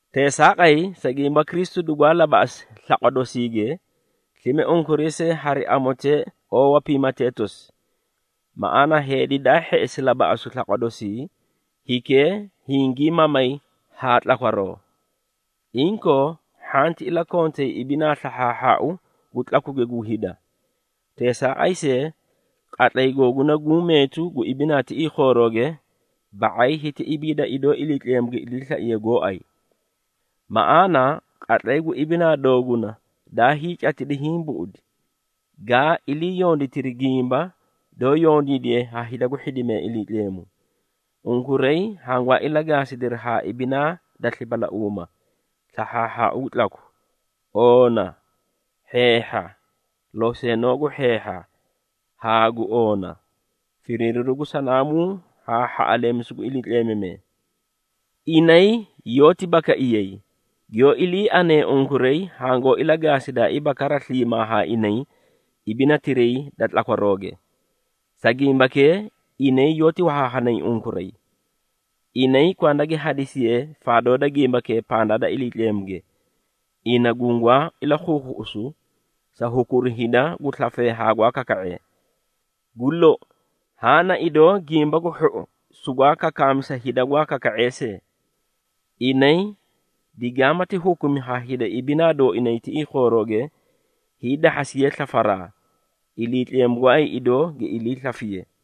Teesaaqay, sa gimba Kristu dugwaa labaꞌasi slaqwa dosiige, slime unkuray see hari amotee oowa piimatee tosi. Maꞌaana, heedi daa hheꞌesi labaꞌasu slaqwa doosii, hikee hingii mamay haa tlakwaroo. Inkoo, hhanti ilakontay ibinaa slahhaahhaau gu tlakuge gu hida. Teesaaqay see, qatlay googuna guũ meetu gu ibinaa tiꞌii khoorooge, ba⁄ay hiti ibiida idoo Iliitleemu gi iliislaiye goóay. Maꞌaana, qatlay gu ibinaa dooguna daa hiicatidi hiĩ buꞌudi, gaa ilii yonditiri gimba, doó yondiidiye ha hida gu hhidimee Iliitleemu. Unkuray hangwaa ilagaasidiri haa ibinaa da slipalauuma, slahhaahhaau gu tlaku, oona, hheehha, loseenoo gu hheehha haa gu oona, firiiriru gu sanaamuu haa hhaꞌaleemisu gu iliitleemamee. Inay yoóti bakaiyayi, giyoó ilii anee unkuray hangoó ilagaasidaaiiba kara sliimaa haa inay ibinatiray da tlakwarooge. Sa gimbakee, inay yoóti wahaahanay unkuray. Inay kwanda gi hadisiyee faadoo da gimbakee pandaa da Iliitleemuge, ina gungwaa ilakhuukhuꞌusu, sa hukuru hida gu slafee haa gwaa kaka⁄ee. Gu lou, haã na idoo Gimba gu Hhou sugwaa kakaami sa hida gwaa kaka⁄ee see. Inay digaamati hukumi ha hida ibinaa dooinay tiꞌii khoorooge, hiidahhasiyee slafaraa, Iliitleemu gooay idoó gi ilii slafiye.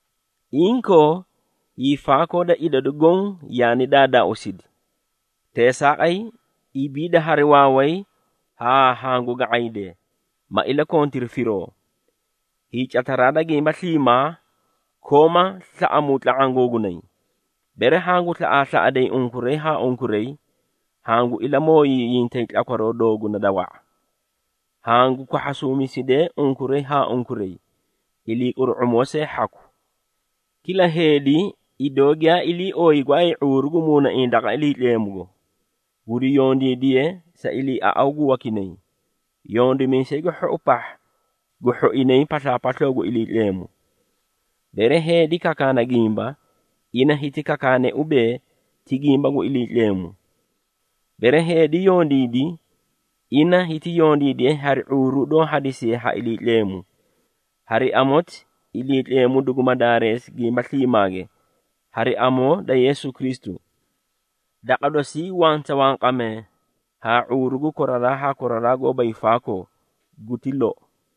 Inkoo, hiifaakoo da idadu goõ yaani daadaauusidi. Teesaaqay, ibiida hari waaway haa hangu ga⁄aydee, ma ilakontiri firoo. Hiicataraa da gimba sliimaa, kooma slaꞌamuu tla⁄aã googunay, bere hangu slaꞌaaslaꞌaday unkuray haa unkuray, hangu ilamooyiyintay tlakwaroo dooguna da wa⁄a. Hangu kwahhasuumisidee unkuray haa unkuray, iliiquru⁄umoo see hhaku. Kila heedi idoo giyaa ilii ooyi gooay ⁄uuru gu muunaiĩ daqa Iliitleemugo, guri yondiidiye sa iliiaꞌaw gu wakinay, yondimiisay gu hhou pahha gu hhoinay paslaapasloo gu Iliitleemu. Bere heedi kakaana gimba, ina hiti kakaane ubee, ti gimba gu Iliitleemu. Bere heedi yondiidi, ina hiti yondiidiye hari ⁄uuru doó hadisiye ha Iliitleemu. Hari amoti, Iliitleemu duguma daareesi gimba sliimaage, hari amoo da Yeesu Kristu. Daqa dosii wanta wanqamee haa ⁄uuru gu koraraa haa koraraa goóba hiifaakoo. Guti lou.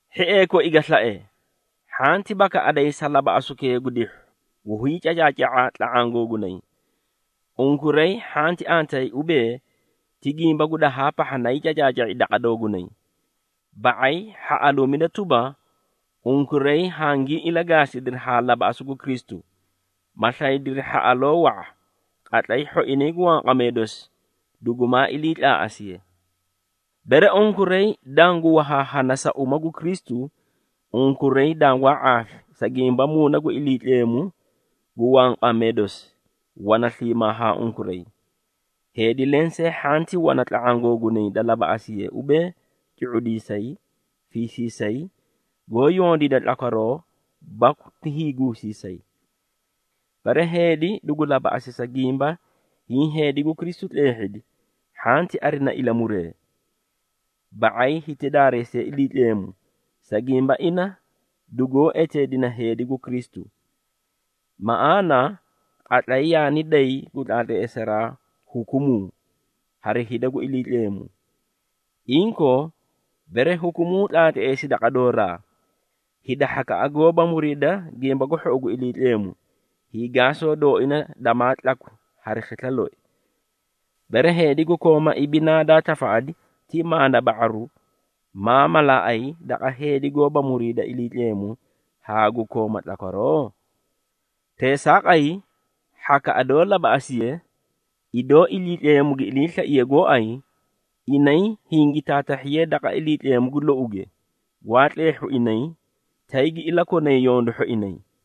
Hhiee koi ga slae, hhanti bakaꞌadayi sa labaꞌasukee gu dihhu, gu hiicacaaca⁄a tla⁄aã googunay. Unkuray hhanti antayi ubee, ti gimba gu dahaa pahha, na hiicacaaca⁄i daqa doogunay. Ba⁄ay hhaꞌaluumida tuba, unkuray hangii ilagaasidiri haa labaꞌasu gu Kristu, ma slaydiri hhaꞌaloo wa⁄a, qatlay hhoinay gu wanqamee dosi dugumaa iliitlaaꞌasiye. Bere unkuray dangu wahaahana sa uma gu Kristu, unkuray dangwaa ⁄aafi, sa gimba Muuna gu Iliitleemu gu wanqamee dosi, wana sliimaa haa unkuray. Heedi lensee hhanti wana tla⁄aã googunay da labaꞌasiye ubee cu⁄udiisay, fiisiisay, goó yondiida tlakwaroo baku ti hiiguusiisay. Bere heedi dugu labaꞌasi sa gimba hiĩ heedi gu Kristu tleehhidi, hhanti arina ilamuree. Ba⁄ay, hiti daareesiye Iliitleemu, sa gimba ina dugoó eteedina heedi gu Kristu. Maꞌaana, qatlay yaani day gu tlaatleesaraa hukumuu, hari hida gu Iliitleemu. Inkoo, bere hukumuu tlaatleesi daqa dooraa, hida hhakaꞌa goóba muriida Gimba gu Hhou gu Iliitleemu, hiigaasoo dooina damaa tlakwi hari khisla loi. Bere, heedi gu kooma ibinaa daa tafaꞌadi ti maana ba⁄aru, maa malaaꞌay daqa heedi goóba muriida Iliitleemu haa gu kooma tlakwaroo? Teesaaqay, hhakaꞌa doó labaꞌasiye, idoo Iliitleemu gi iliislaiye gooay, inay hingi taatahhiyee daqa Iliitleemu gu louge, gwaa tleehhu inay, tay gi ilakonay yondu hhoinay.